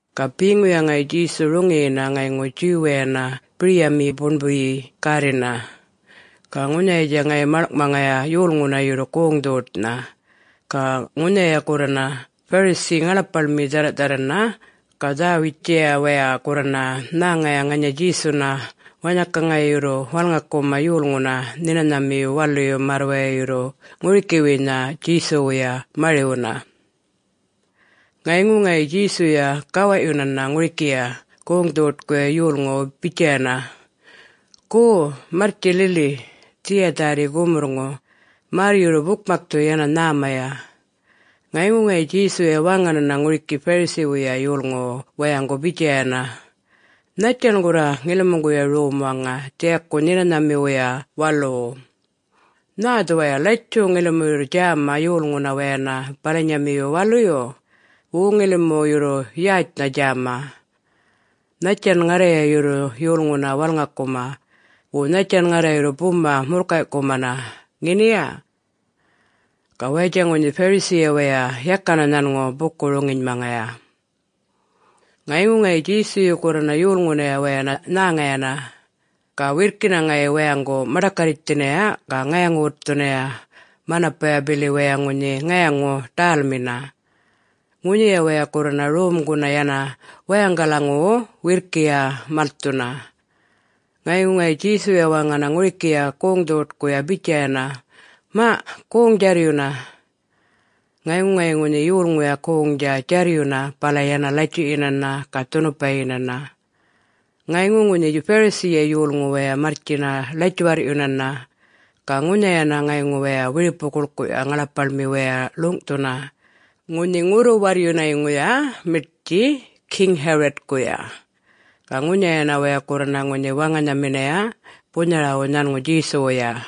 Ga beŋuya ŋayi Djesu roŋiyina ŋayŋu Jew-wayana biryamiyi buṉbuyi gärrina. Ga ŋunhayatja ŋayi malŋꞌmaŋaya yolŋuna yurru goŋ-dhoṯnha. Ga ŋunhaya gurrana Pharisee ŋaḻapaḻmi dhärraꞌdharrana ga dharr-witjaya waya gurrana nhäŋaya ŋanya Djesuna wanhaka ŋayi yurru walŋakuma yolŋuna Nhinanhamiyu Waluyu märr waya yurru ŋurikiwuynha Djesuwuya mariwuna. Ŋayŋu ŋayi Djesuya gawaꞌyunana ŋurikiya goŋ-dhoṯkuya yolŋuwu bitjayana, “Go, marrtji lili, dhiya dhärri gumurrŋu, märr yurru bukmakthu yana nhämaya.” Ŋayŋu ŋayi Djesuya waŋanana ŋuriki Pharisee-wuya yolŋuwu wayaŋgu bitjayana, “Nhattjan gurra ŋilimuŋguya rom waŋa dhiyaku Nhinanhamiwuya Waluwu? Nhä dhuwaya latjuꞌ ŋilimu yurru djäma yolŋuna wayana balanyamiyu waluyu, wo ŋilimu yurru yätjnha djäma? Nhattjan ŋarraya yurru yolŋuna walŋakuma, wo nhattjan ŋarra yurru buma murrkayꞌkumana, ŋeniya?” Ga wayatja ŋunhi Pharisee-ya waya yakana nhanŋu buku-roŋinymaŋaya. Ŋayŋu ŋayi Djesuyu gurrana yolŋunaya wayana nhäŋayana, ga wirrkina ŋayi wayaŋgu maḏakarritjthinaya ga ŋayaŋu-wutthunaya manapaya bili waya ŋunhi ŋayaŋu-ḏälmina. Ŋunhiya waya gurrana romguna yana wayaŋgalaŋuwu wirrkiya malthuna. Ŋayŋu ŋayi Djesuya waŋana ŋurikiya goŋ-dhoṯkuya bitjayana, “Maꞌ, goŋdja djarryuna!” Ŋayŋu ŋayi ŋunhi yolŋuya goŋdja djarryuna bala yana latjuꞌyinana ga dhunupayinana. Ŋayŋu ŋunhi Pharisee-ya yolŋu waya marrtjina latjuwarrꞌyunana, ga ŋunhayana ŋayŋu waya wiripu-guḻkuꞌya ŋaḻapaḻmi waya ḻuŋꞌthuna, ŋunhi ŋurru-warryunayŋuya miṯtji King Herod-kuya. Ga ŋunhayana waya gurrana ŋunhi waŋanhaminaya bunharawu nhanŋu Djesuwuya.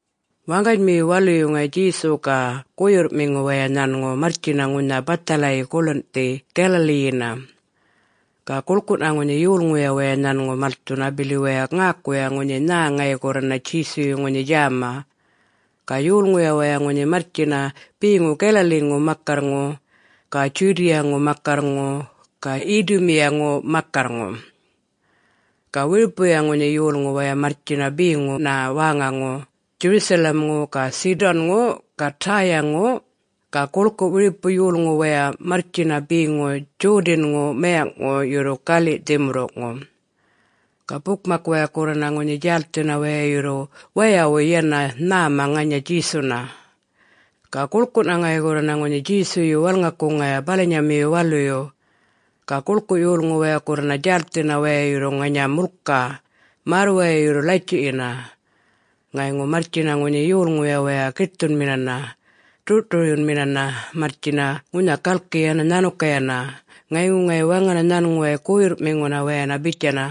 Waŋganymiyu waluyu ŋayi Djesu ga guyurrꞌmiŋu waya nhanŋu marrtjina ŋunha bathalayi guḻunꞌthi Galilee-yina. Ga guḻkuꞌna ŋunhi yolŋuya waya nhanŋu malthuna bili waya ŋäkuya ŋunhi nhä ŋayi gurrana Djesuyu ŋunhi djäma. Ga yolŋuya waya ŋunhi marrtjina beŋu Galilee-ŋu makarrŋu ga Judea-ŋu makarr-ŋu ga Idumea-ŋu makarrŋu. Ga wiripuya ŋunhi yolŋu waya marrtjina beŋuna wäŋaŋu Jerusalem-ŋu ga Sidon-ŋu ga Tyre-ŋu. Ga guḻkuꞌ wiripu yolŋu waya marrtjina beŋu Jordan-ŋu mayaŋꞌŋu yurru galiꞌ dhimurruŋu. Ga bukmak waya gurrana ŋunhi djälthina waya yurru wayawuy yana nhäma ŋanya Djesuna. Ga guḻkuꞌna ŋayi gurrana ŋunhi Djesuyu walŋakuŋaya balanyamiyu waluyu. Ga guḻkuꞌ yolŋu waya gurrana djälthina waya yurru ŋanya mulka, märr waya yurru latjuꞌyina. Ŋayŋu marrtjina ŋunhi yolŋuya waya giṯthunminana, ḏurꞌṯuryunminana marrtjina ŋunha galki yana nhanukayana, ŋayŋu ŋayi waŋana nhanŋuway guyurrꞌmiŋuna wayana bitjaya,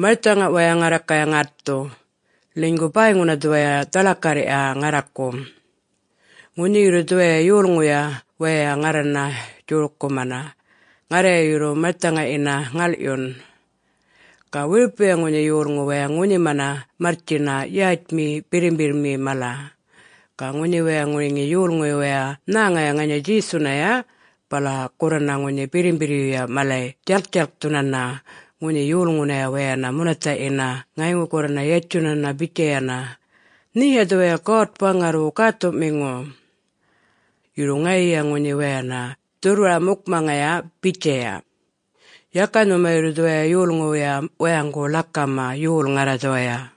“Marthaŋa waya ŋarrakaya ŋätthu, ḻinygu bäyŋuna dhuwaya dhaḻakarrya ŋarraku. Ŋunhi yurru dhuwaya yolŋuyuya wayay ŋarrana djorkumana, ŋarraya yurru marthaŋayina ŋalꞌyun.” Ga wiripuya ŋunhi yolŋu waya ŋunhima marrtjina yätjmi birrimbirrmi mala. Ga ŋunhi waya ŋuriŋi yolŋuy wayay nhäŋaya ŋanya Djesunaya, bala gurrana ŋunhi birrimbirryuya malay djalktjalkthunana ŋunhi yolŋunaya wayana munathaꞌyina ŋayŋu gurrana yatjunana bitjayana, “Nheya dhuwaya God-Waŋarrwu Gäthuꞌmiŋu.” Yurru ŋayiya ŋunhi wayana dhurrwara-mukmaŋaya bitjaya, “Yaka nhuma yurru dhuwaya yolŋuwuya wayaŋgu ḻakama, yol Ŋarra dhuwaya!”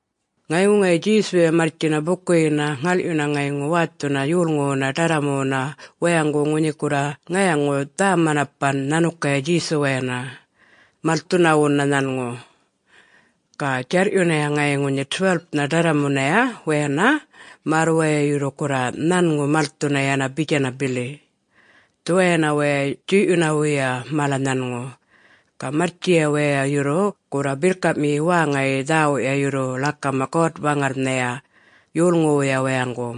Ŋayŋu ŋayi Djesuya marrtjina bukuyina ŋalꞌyuna ŋayŋu wäthuna yolŋuwuna ḏarramuwuna wayaŋgu ŋunhi gurra ŋayaŋu dhä-mananapan nhanukaya Djesuwayana, malthunawuna nhanŋu. Ga djarrꞌyunaya ŋayi ŋunhi 12-nha ḏarramunaya wayana märr waya yurru gurra nhanŋu malthuna yana bitjana bili, dhuwayana waya djuyꞌyunawuya mala nhanŋu. Ga marrtjiya waya yurru gurra birrkaꞌmiyi wäŋayi dhäwuꞌya yurru ḻakama God-Waŋarrnhaya yolŋuwuya wayaŋgu.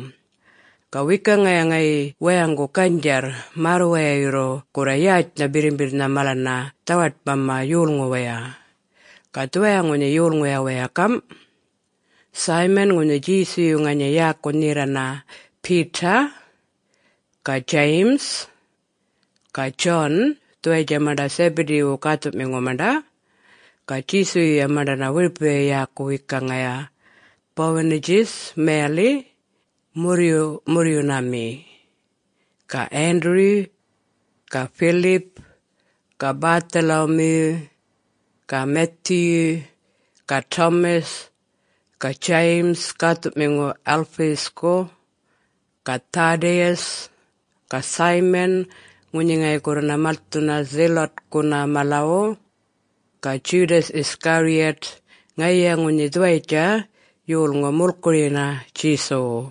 Ga wekaŋaya ŋayi wayaŋgu ganydjarr, märr waya yurru gurra yätjnha birrimbirrnha malana dhawaṯmama yolŋuwaya. Ga dhuwaya ŋunhi yolŋuya waya gamꞌ: Simon (ŋunhi Djesuyu ŋanya yäku nherraya Peter) ga James, ga John, dhuwayatja maṉḏa Zebedee-wu gäthuꞌmiŋu maṉḏa. (Ga Djesuyuya maṉḏana wiripuya yäku wekaŋaya, Boanerges mayaliꞌ ‘Murryuꞌmurryunami’.) ga Andrew ga Philip ga Bartholomew ga Matthew ga Thomas ga James (gäthuꞌmiŋu Alphaeus-ku) ga Thaddaeus ga Simon, (ŋunhi ŋayi gurrana malthuna Zealot-kuna malawu) ga Judas Iscariot (ŋayiya ŋunhi dhuwayatja yolŋu mulkuruyina Djesuwu.)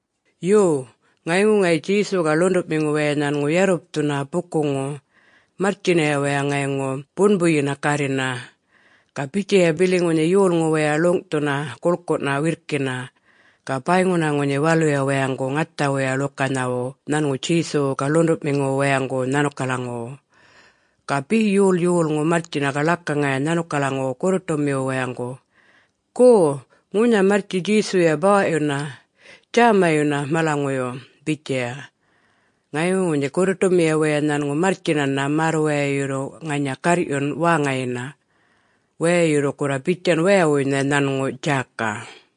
Yo, ŋayŋu ŋayi Djesu ga ḻuṉḏuꞌmiŋu waya nhanŋu yarrupthuna bukuŋu. Marrtjinaya waya ŋayŋu buṉbuyina gärrina. Ga bitjaya bili ŋunhi yolŋu waya ḻuŋꞌthuna guḻkuꞌna wirrkina, ga bäyŋuna ŋunhi waluya wayaŋgu ŋathawuya ḻukanhawu nhanŋu Djesuwu ga ḻuṉḏuꞌmiŋuwu wayaŋgu nhanukalaŋuwu. Ga be yol yolŋu marrtjina ga ḻakaŋaya nhanukalaŋuwu gurruṯumiwu wayaŋgu, “Go, ŋunha marrtji Djesuya bawaꞌyuna, djämayuna, malaŋuyu!” bitjaya. Ŋayŋu ŋunhi gurruṯumiya waya nhanŋu marrtjinana märr waya yurru ŋanya garrꞌyun wäŋayina. Waya yurru gurra bitjan wayawuynha nhanŋu djäka.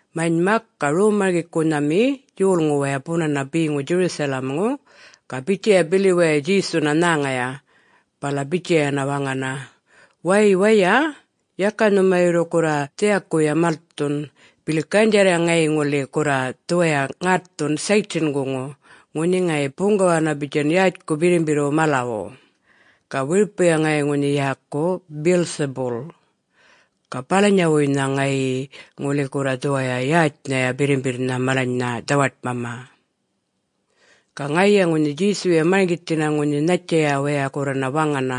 Manymak, ga rom-marŋgikunhami yolŋu waya bunana beŋu Jerusalem-ŋu ga bitjaya bili waya Djesuna nhäŋaya, bala bitjayana waŋana, “Way, waya, yaka nhuma yurru gurra dhiyakuya malthun, bili ganydjarrya ŋayi ŋuli gurra dhuwaya ŋätthun Satan-guŋu ŋunhi ŋayi buŋgawana bitjan yätjku birrimbirrwu malawu, ga wiripuya ŋayi ŋunhi yäku Beelzebul. Ga balanyawuynha ŋayi ŋuli gurra dhuwaya yätjnhaya birrimbirrnha malanynha dhawaṯmama.” Ga ŋayiya ŋunhi Djesuya marŋgithina ŋunhi nhattjaya waya gurrana waŋana,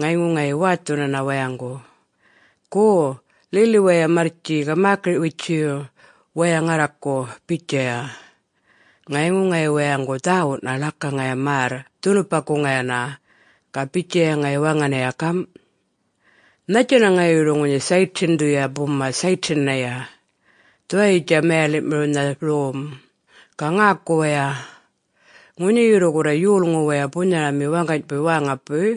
ŋayŋu ŋayi wäthunana wayaŋgu, “Go, lili waya marrtji ga mäkiriꞌ-witjuyu waya ŋarraku,” bitjaya. Ŋayŋu ŋayi wayaŋgu dhäwuꞌna ḻakaŋaya märr dhunupakuŋayana. Ga bitjaya ŋayi waŋanaya gamꞌ, “Nhattjana ŋayi yurru ŋunhi Satan-dhuya buma Satan-naya? Dhuwayitja mayaliꞌmiriwnha rom. Ga ŋäku waya! Ŋunhi yurru gurra yolŋu waya bunharami wäŋganybuy wäŋawuy,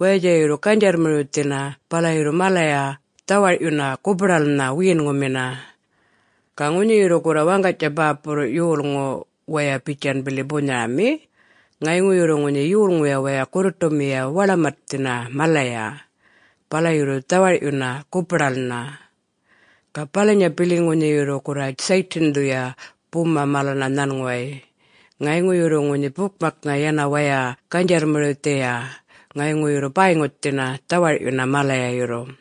wayatja yurru ganydjarrmiriwthina bala yurru malaya dhawarꞌyun gupa-ḏälnha wiyinŋumina. Ga ŋunhi yurru gurra waŋgany bäpurruꞌ yolŋu waya bitjan bili bunharami, ŋayŋu yurru ŋunhi yolŋuya waya gurruṯumiya waḻamaṯthina malaya, bala yurru dhawarꞌyuna gupa-ḏälnha. Ga balanya bili, ŋunhi yurru gurra Satan-dhuya buma malana nhanŋuway, ŋayŋu yurru ŋunhi bukmaknha yana waya ganydjarrmiriwthiya ŋayŋu yurru bäyŋuthina, dhawarꞌyuna malaya yurru!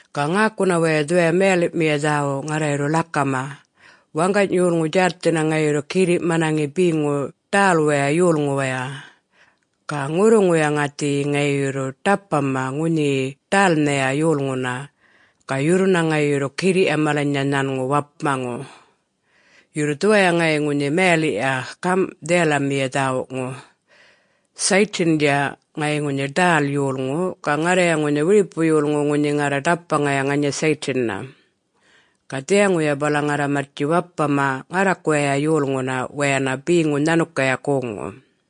Ga ŋäkuna waya dhuwaya mayaliꞌmiya dhäwuꞌ ŋarra yurru ḻakama: Waŋgany yolŋu djälthina ŋayi yurru girriꞌ manaŋi beŋu ḏälwaya yolŋuwaya. Ga ŋurruŋuya ŋäthiyi ŋayi yurru ḏapmama ŋunhiyi ḏälnhaya yolŋuna, ga yurruna ŋayi yurru girriꞌya malanynha nhanŋu wapmaŋu. [Yo, dhuwaya ŋayi ŋunhi mayaliꞌya gamꞌ dhiyalamiya dhäwuꞌŋu: Satan-dja, ŋayi ŋunhi ḏäl yolŋu ga ŋarraya ŋunhi wiripu yolŋu ŋunhi ḏapmaŋaya ŋanya Satan-na. Ga dhiyaŋuya bala ŋarra marrtji wapmama ŋarrakuwaya yolŋuna wayana beŋu nhanukaya goŋŋu.]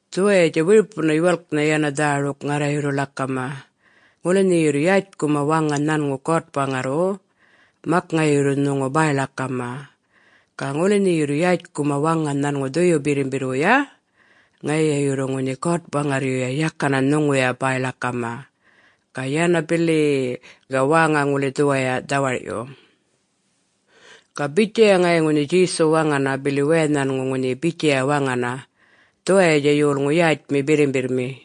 Dhuwayatja wiripuna yuwalknha yana dhäruk ŋarra yurru ḻakama. Ŋuli nhe yurru yätjkuma waŋa nhanŋu God-Waŋarrwu, mak ŋayi yurru nhuŋu bäy-ḻakama. Ga ŋuli nhe yurru yätjkuma waŋa nhanŋu Dhuyu Birrimbirrwuya, ŋayiya yurru ŋunhi God-Waŋarryuya yakana nhuŋuya bäy-ḻakama, ga yana bili-i-i ga wäŋa ŋuli dhuwaya dhawarꞌyu!” Ga bitjaya ŋayi ŋunhi Djesu waŋana, bili waya nhanŋu ŋunhi bitjaya waŋana, “Dhuwayatja yolŋu yätjmi birrimbirrmi.”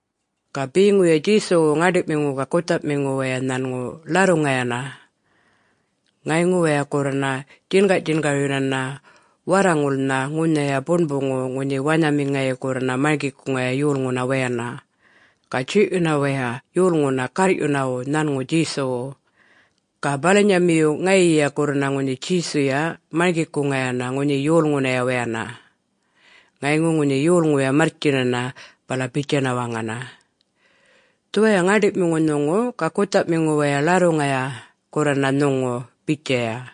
Ga beŋuya Djesuwu ŋäṉdiꞌmiŋu ga guthaꞌmiŋu waya nhanŋu ḻarruŋayana. Ŋayŋu waya gurrana djingarꞌdjingaryunana warraŋulnha ŋunhaya buṉbuŋu ŋunhi wanhami ŋayi gurrana marŋgikuŋaya yolŋuna wayana. Ga djuyꞌyuna waya yolŋuna garrꞌyunawu nhanŋu Djesuwu. Ga balanyamiyu ŋayiya gurrana ŋunhi Djesuya marŋgikuŋayana ŋunhi yolŋuna wayana. Ŋayŋu ŋunhi yolŋuya marrtjinana, bala bitjana waŋa, “Dhuwaya ŋäṉḏiꞌmiŋu nhuŋu ga guthaꞌmiŋu waya ḻarruŋaya gurrana nhuŋu,” bitjaya.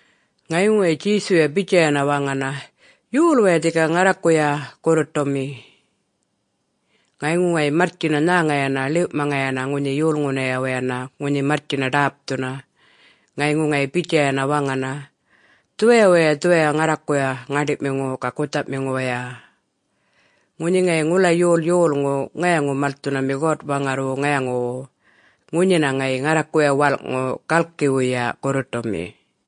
Ŋayŋu ŋayi Djesuya bitjayana waŋana, “Yol waya dhika ŋarrakuya gurruṯumi?” Ŋayŋu ŋayi marrtjina nhäŋayana ḻiwꞌmaŋayana ŋunhi yolŋunaya wayana ŋunhi marrtjina ḏäpthuna. Ŋayŋu ŋayi bitjayana waŋana, “Dhuwaya waya dhuwaya ŋarrakuya ŋäṉḏiꞌmiŋu ga guthaꞌmiŋu waya. Ŋunhi ŋayi ŋula yol yolŋu ŋayaŋu-malthunami God-Waŋarrwu ŋayaŋuwu, ŋunhina ŋayi ŋarrakuya walꞌŋu galkiwuya gurruṯumi.”